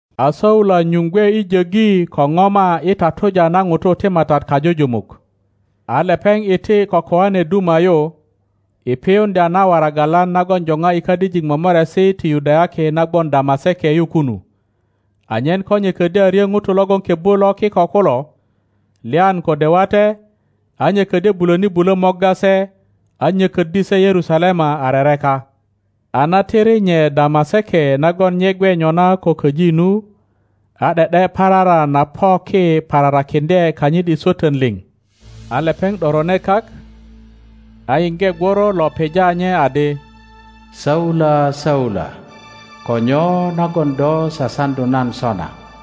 A Saula nyuŋ gwe i jöggi kopoma i tatuja na ŋutu ti Matat kajujumuk, a lepeŋ iti ko koane duma yu, i piyuŋdya na waragalan nagon jopa i kadijik momoresi ti Yudayaki na gwon Damaseke yu kunu, anyen ko nye ködyö a ryö ŋutu logon kebbu lo Kiko kulo, lyan kode wate, a nye ködyo bulöni bulö morga se, a nyököddi se Yerusalema a rereka. A na tiri nye Damaseke nagon nye gwe nyona ko köji nu, a ’de ’de parara na po ki pararakiŋdye kanyit i swötön liŋ. A lepeŋ ’dorone kak, a yiŋge gworo lo pija nye adi, Saula, Saula, ko nyo nagon do sasaŋdu nan sona?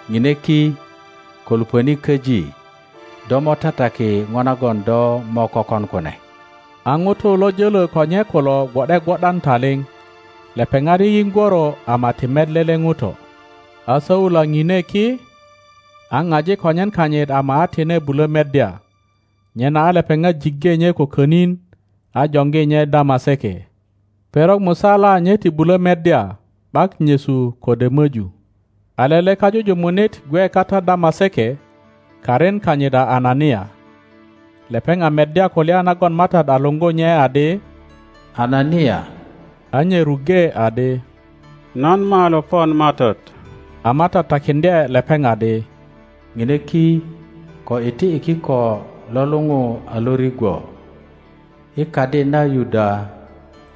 Ŋine ki, ko luŋöni köji, do mo tataki po nagon do mo kökon kune. A ŋutu lo jölö ko nye kulo gwo ’de gwo ’dan taliŋ; lepeŋat yiyiŋ gworo ama ti met lele ŋuto. A Saula pine ki, a paji konyen kanyit ama a tine bulö meddya, nyena a lepeŋat jiŋge nye ko könin, a joŋgi nye Damaseke. Perok musala nye ti bulö meddya, ’bak nyesu kode möju. A lele kajujumunit gwe kata Damaseke, karin kanyit a Anania. Lepeŋ a meddya kulya nagon Matat a luŋgu nye adi, Anania. A nye ruŋge adi, Nan malo pon Matat. A Matat takiŋdye lepeŋ adi, Ŋine ki, ko iti i kiko lo luŋu a Lorigwo, i kadi na Yuda,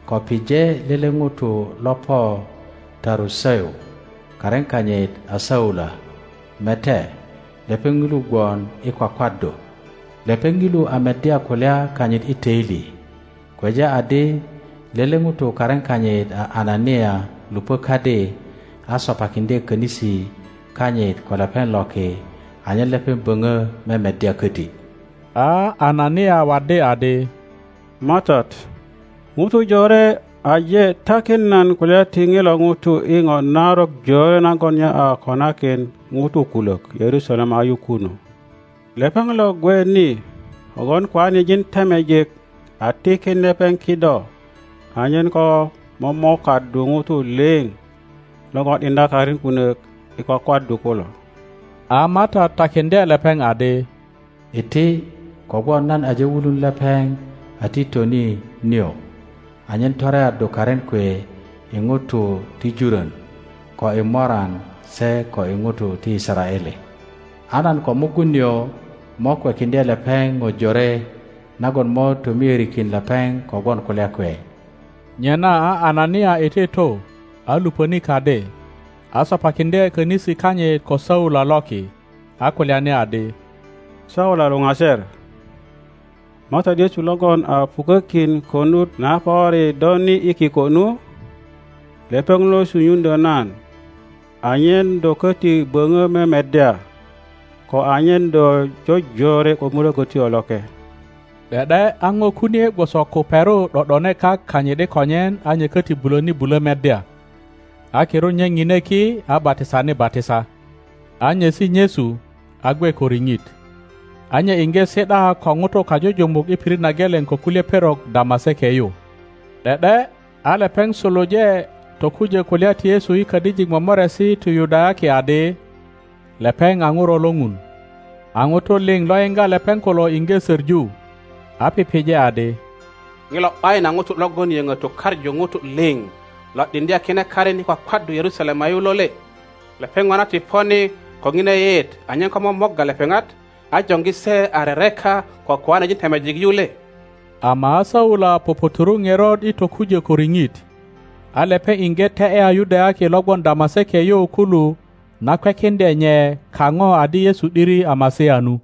ko pije lele ŋuto lo po Taruseu, karin kanyit a Saula; mete, lepeŋ ŋilu gwon i kwakwaddu. Lepeŋ ŋilu a meddya kulya kanyit i töili, kweja adi lele ŋuto karin kanyit a Anania luŋö kadi, a sopakiŋdye könisi kanyit ko lepeŋ loki anyen lepeŋ böpö memeddya köti. A Anania waddi adi, Matat, ŋutu jore aje takin nan kulya ti ŋilo ŋuto i po narok jore nagon nye a konakin ŋutu kulök Yerusalema yu kunu. Lepeŋ lo gwe ni kogwon koanejin temejik a tikin lepeŋ kido anyen ko momokaddu ŋutu liŋ logon ’diŋdya karin kunök i kwakwaddu kulo. A Matat takiŋdye lepeŋ adi, Iti, kogwon nan aje wulun lepeŋ a titoni nio, anyen toreaddu karin kwe i ŋutu ti jurön, ko i moran se ko i ŋutu ti Yisaraele. A nan ko mugun nio mo kwekiŋdye lepeŋ po jore nagon mo tomiörikin lepeŋ kogwon kulya kwe. Nyena a Anania iti tu, a luŋöni kadi, a sopakiŋdye könisi kanyit ko Saula loki, a kulyani adi, Saula luŋaser, Matat Yesu logon a pukökin konut na pöri do ni i kiko nu, lepeŋ lo sunyuŋdyö nan anyen do köti böŋö memeddya, ko anyen do jojore ko Mulökötyo Loke. ’De ’de a ŋo kunie gwoso kuperu ’do ’done kak kanyit i konyen a nye koti buloni bulo meddya. A kirut nye ŋine ki a batisani batisa, a nyesi nyesu, a gwe ko riŋit. Saula tokujo Damaseke A nye iŋge si ’da ko ŋutu kajujumuk i pitit na geleŋ ko kulye perok Damaseke yu. ’De ’de a lepeŋ suluje tokujo kulya ti Yesu i kadijik momoresi ti Yudayaki adi, lepeŋ a Ŋuro lo Ŋun. A ŋutu lio lo yiŋga lepeŋ kulo iŋge soŋu, a pije adi, Ŋilo ’bayin a ŋuto logon yöŋö tukaŋu ŋutu liŋ lo ’diŋdya kine karin i kwakwaddu Yerusalema yu lo le? Lepeŋ ŋona ti po ni ko ŋina yeyeet anyen ko momorga lepeŋat, a joŋgi se a rereka ko koanejin temejik yu le? Ama a Saula puputuru ŋerot i tokujo ko riŋit, a lepeŋ iŋge te ’ya Yudayaki lo gwon Damaseke yu kulu na kwekiŋdye nye kaŋo adi Yesu ’diri a Masia nu.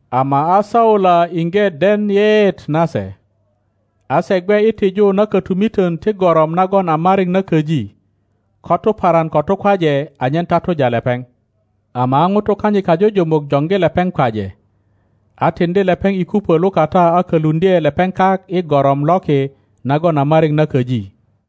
ama a Saula iŋge den yeyeet nase. A se gwe i tiju na kotumiton ti gorom nagon a mariŋ na köji, ko tuparan ko tukwaje anyen tatuja lepeŋ; ama a ŋutu kanyit kajujumuk joŋgi lepeŋ kwaje, a tiŋdi lepeŋ i kupö lukata a koluŋdye lepeŋ kak i gorom loki nagon a mariŋ na köji.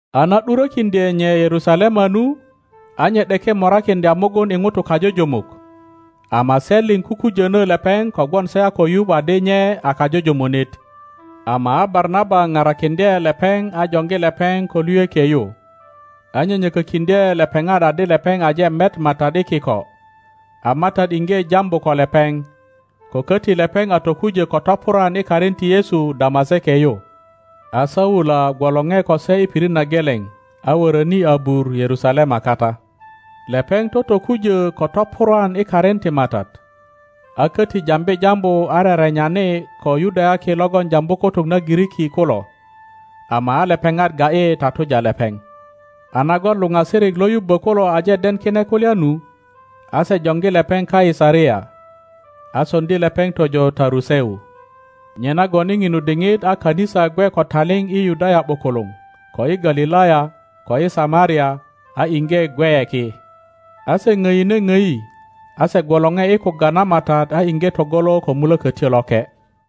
A na ’durokiŋdye nye Yerusalema nu, a nye ’deke morakiŋdya mugun i ŋutu kajujumuk, ama se liŋ kukujono lepeŋ kogwon se a ko yuŋ adi nye a kajujumunit. Ama a Barnaba parakiŋdye lepeŋ a joŋgi lepeŋ ko luyökie yu, a nyönyökökiŋdye lepeŋat adi lepeŋ aje met Matat i kiko, a Matat iŋge jambu ko lepeŋ, ko koti lepeŋ a tokujo ko topurwan i karin ti Yesu Damaseke yu. A Saula gwolore ko se i pirit na geleŋ, a wöröni abur Yerusalema kata. Lepeŋ totokujö ko topurwan i karin ti Matat, a koti jambi jambu a rerenyani ko Yudayaki logon jambu kutuk na Giriki kulo. Ama a lepeŋat ga ’yi tatuja lepeŋ, a nagon luŋasirik lo yubbo kulo aje den kine kulya nu, a se joŋgi lepeŋ Kaisaria, a soŋdi lepeŋ tojo Taruseu. Nyenagon i ŋinu diŋit a kanisa gwe ko taliŋ i Yudaya ’bukuluŋ, ko i Galilaya, ko i Samaria, a iŋge gweye ki; a se ŋdine obi, a se gwolore i kugga na Matat a iŋge togolo ko Mulokotyo Loke.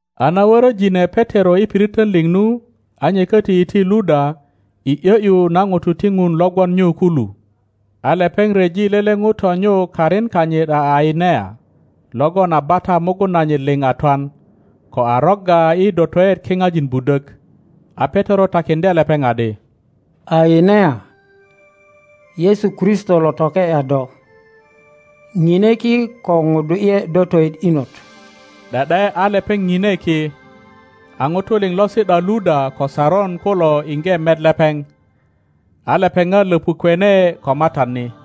A na worojine Petero i piriton liŋ nu, a nye koti iti Luda i ’yo ’yu na ŋutu ti Ŋun lo gwon nyu kulu. a lepeŋ ryeji lele ŋuto nyu karin kanyit a Ainea logon a bata mugun nanyit liŋ a twan, ko a rogga i dotoet kiŋajin budok. A Petero takiŋdye lepeŋ adi, Ainea, Yesu Kristo lo toke ’ya do, ŋine ki ko ŋudu ’ye dotoet inot. ’De ’de a lepeŋ ŋine ki. a ŋutu liŋ lo si ’da Luda ko Saron kulo iŋge met lepeŋ, a lepeŋat löpukwene ko Matat ni.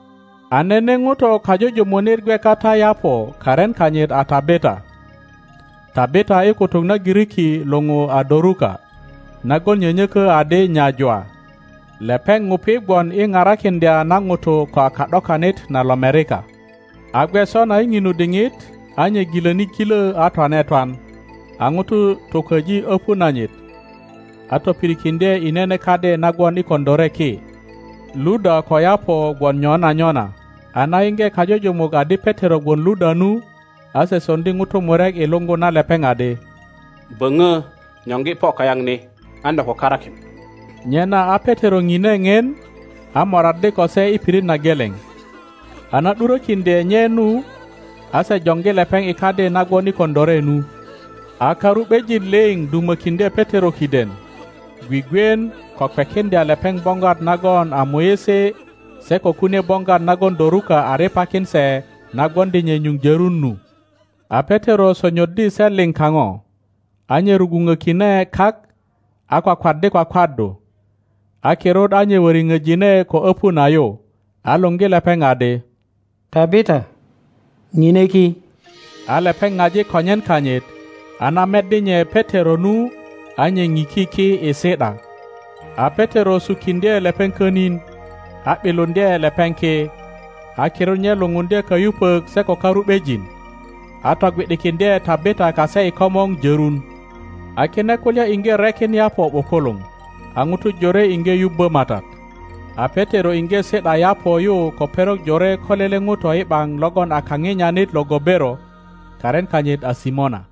A nene ŋuto kajujumunit gwe kata Yaŋo karin kanyit a Tabita. (Tabita i kutuk na Giriki luŋu a Doruka, nagon nyönyökö adi Nyajwa.) Lepeŋ ŋupi gwon i parakiŋdya na ŋutu ko a ka ’dokanit na lomerika. a gwe sona i ŋinu diŋit, a nye gilö ni ŋilo a twane twan, a ŋutu tukwoji öpu nanyit, a topirikiŋdye i nene kadi na gwon i koŋilore ki. Luda ko Yaŋo gwon nyona nyona, a na yiŋge kajujumuk adi Petero gwon Luda nu, a se soŋdi ŋutu murek i luŋgu na lepeŋ adi, Böŋo nyoŋgi po kayaŋ ni, an do ko karakin. Nyena a Petero ŋine ŋien, a moraddi ko se i pirit na geleŋ. A na ’durökiŋdye nye nu, a se joŋgi lepeŋ i kadi na gwon i koŋilore nu. A karu ’bejin liŋ dumökiŋdye Petero kiden, gwigwien ko kwekiŋdya lepeŋ boŋgwat nagon a muisi se ko kunie boŋgwat nagon Doruka a riŋakin se na gwoŋdi nye nyuŋ jörun nu. A Petero sonyoddi se liŋ kaŋo, a nye rugwuŋökine kak, a kwakwaddi kwakwaddu. A kirut a nye wöriŋöjine ko öpu na yu, a luŋgi lepeŋ adi, Tabita, ŋine ki. A lepeŋ ŋaji konyen kanyit, a na meddi nye Petero nu, a nye ŋiki ki i si ’da. A Petero sukiŋdye lepeŋ könin, a ’biluŋdye lepeŋ ki, a kirut nye lupundye kayupök se ko karu ’bejin, a togwi ’dikiŋdye Tabita kase i komor jörun. A kine kulya iŋge rekin Yaŋo ’bukuluŋ, a ŋutu jore iŋge yubbö Matat. A Petero iŋge si ’da Yaŋo yu ko perok jore ko lele ŋuto i ’baŋ logon a kaŋinyanit lo gobero, karin kanyit a Simona.